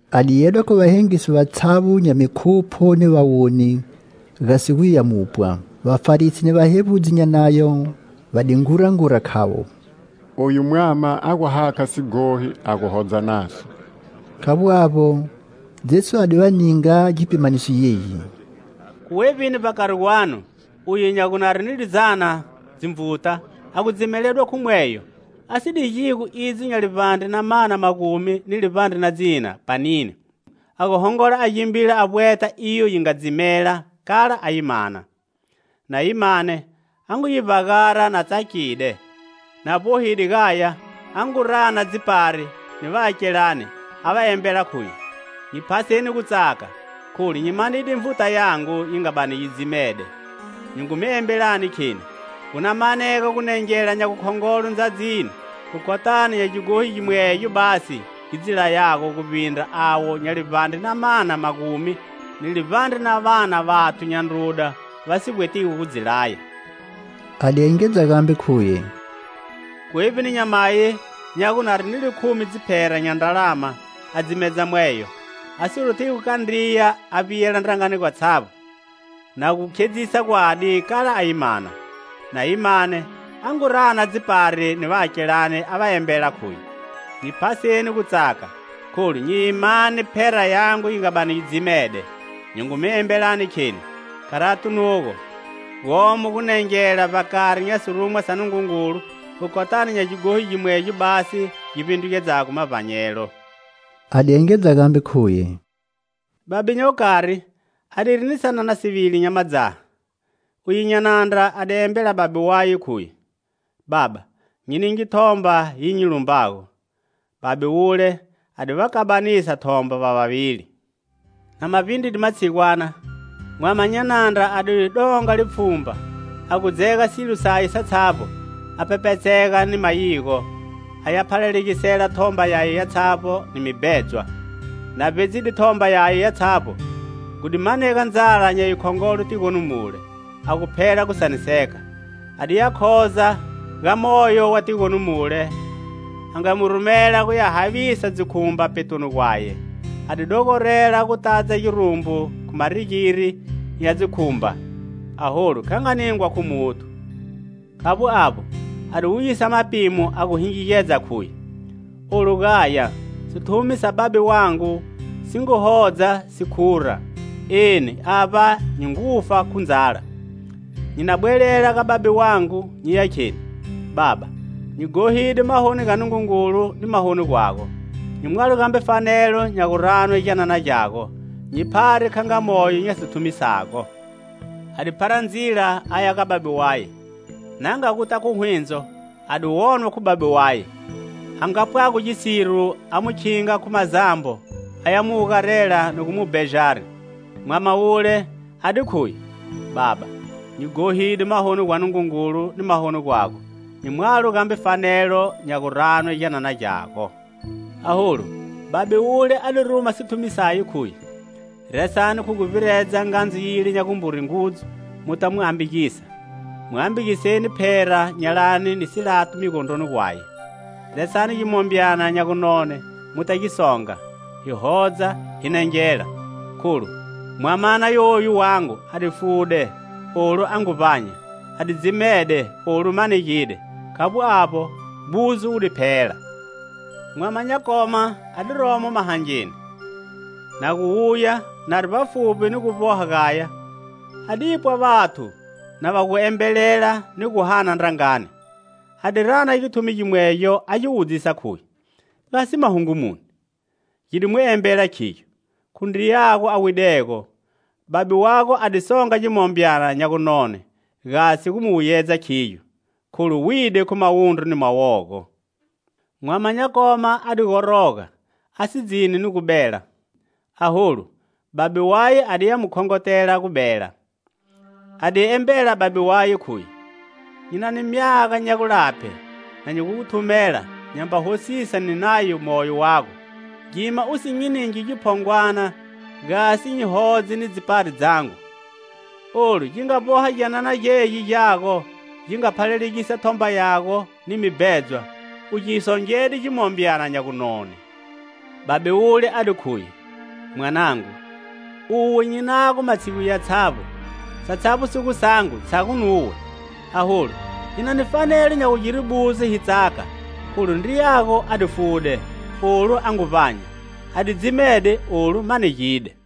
A di yedwa khu vahengisi vatshavbo nya mikhupho ni vawoni, gasi guya mu pwa. Vafarisi ni vahevbudzi nya Nayo va di ngurangura, khavo: "Oyu mwama a gu hakha sighohi, a gu hodza naso." Khavbo avbo, Jesu a di va ninga gipimaniso gegi: "Khu wevbi, vbakari gwanu uye nya gu nari ni lizana dzinvuta, a gu dzimeledwa khu mweyo, a si digigo idzo nya livbandre na mana magumi ni livbandre na dzina panini, a gu hongola a gimbila a vbweta iyo yi nga dzimela, kala a yi mana? Na yi mane, a ngu yi vbagara na tsakide; na vbohide gaya, a ngu rana dzipari ni vaakelane, a va embela, khuye: 'Nyi phaseni gu tsaka, kholu nyi manide nvuta yangu yi nga bani yi dzimede.' Nyi ngu mi embelani kheni: gu na manega gunengela nya gukhongolo ndzadzini khu kotani nya gighohi gimwegyo basi gi dzi layago guvbindra avo nya livbandre na mana magumi ni livbandre na va na vathu nya ndruda va si vbwetigo gu dzi laya." A di engedza gambe, khuye: "Khu wevbini nyamayi, nya gu, nari ni likhumi dziphera nya ndralama a dzimedza mweyo, a si rothigo kandriya, a vbiyela ndrangani gwatshavbo, na gu khedzisa gwadi, kala a yi mana? Na yi mane, a ngu rana dzipari ni vaakelane, a va embela khuye: 'Nyi phaseni gu tsaka, kholu nyi yi mane phera yangu yi nga bani yi dzimede.' Nyi ngu mi embelani kheni: kharati nugo, gomo gunengela vbakari nya sirumwa sa Nungungulu khu kotani nya gighohi gimwegyo basi gi vbindrugedzago mavbanyelo." A di engedza gambe, khuye: "Babe nya gukari a diri ni sanana sivili nya madzaha. Uye nya nandra a di embela babe waye, khuye: 'Baba, nyi ninge thomba yi nyi lumbago.' Babe wule a di va kabanisa thomba va vavili. Na ma vbindride matshigwana, mwama nya nandra a di donga lipfhumba, a gu dzega silo saye satshavbo, a pepetseka ni mayigo, aya phalalegisa thomba yaye yatshavbo ni mibhedzwa. Na vbedzide thomba yaye yatshavbo, gu di manega ndzala nya yikhongolo tigoni mule, a gu phela gu saniseka. A diya khoza ga moyo wa tigoni mule, a nga mu rumela guya havisa dzikhumba petoni gwaye. A di dogorela gu tadza girumbu khu marigiri nya dzikhumba, aholu kha nga ningwa khu muthu. Khavbo avbo, a di wuyisa mapimo, a gu hingigedza, khuye: 'Olu gaya, sithumi sa babe wangu si ngu hodza si khura, eni avba nyi ngu fa khu ndzala! Nyi na bwelela ga babe wangu nyiya kheni: Baba, nyi ghohide mahoni ga Nungungulu ni mahoni gwago. Nyi mwalo gambe fanelo nya gu ranwe gyanana gyago, nyi phare kha nga moyo nya sithumi sago!' A di phara ndzila aya ga babe waye."Na nga guta khu hwindzo, a di wonwa khu babe waye, a nga pwago gisiro, a mu khinga khu mazambo, aya mu wugarela ni gu mu bejari. Mwamana wule a di khuye: 'Baba, nyi ghohide mahoni gwa Nungungulu ni mahoni gwago, nyi mwalo gambe fanelo nya gu ranwe gyanana gyago.' Aholu babe wule a di ruma sithumi saye, khuye: 'Resani khu guvbiredza ngandzu yile nya gumbure ngudzu muta mu ambagisa; mu ambagiseni phera nyalani ni silato migondroni gwaye. Resani gimombyana nya gu none muta gi songa, hi hodza, hi nengela, kholu mwamana yoyu wangu a di fude, olu a ngu vbanya; a di dzimede, olu manegide.' Khavbo avbo, buzo wu di phela. "Mwama nya koma a di romo mahangeni. Na gu wuya, nari vbafuvbi ni gu vboha gaya, a di pwa vathu na va gu embelela ni gu hana ndrangani. A di rana githumi gimwegyo a gi wudzisa, khuye: 'Gasi mahungu muni?' Gi di mu embela, khigyo:'Khu ndriyago a widego. Babe wago a di songa gimombyana nya gunone, gasi gu mu wuyedza khigyo, kholu wide khu mawundru ni mawogo.' Mwama nya koma a di goroga, a si dzini ni gu bela. Aholu, babe waye a diya mu khongotela gu bela. A di embela babe waye, khuye: 'Nyi na ni myaga nya gulaphe na nyi gu gu thumela nyamba hosisa ni nayo moyo wago; gima u si nyi ningi giphongwana, gasi nyi hodze ni dzipari dzangu. Olu gi nga vboha gyanana gegi gyago gi nga phalalegisa thomba yago ni mibhedzwa, u gi songede gimombyana nya gunone.' Babe wule a di khuye: 'Mwanangu, uwe nyi nago matshigu yatshavbo; satshavbo si gu sangu tshago nuwe. Aholu hinani fanelo nya gugire buzo, hi tsaka, kholu ndriyago a di fude, olu a ngu vbanya; a di dzimede, olu manegide.' "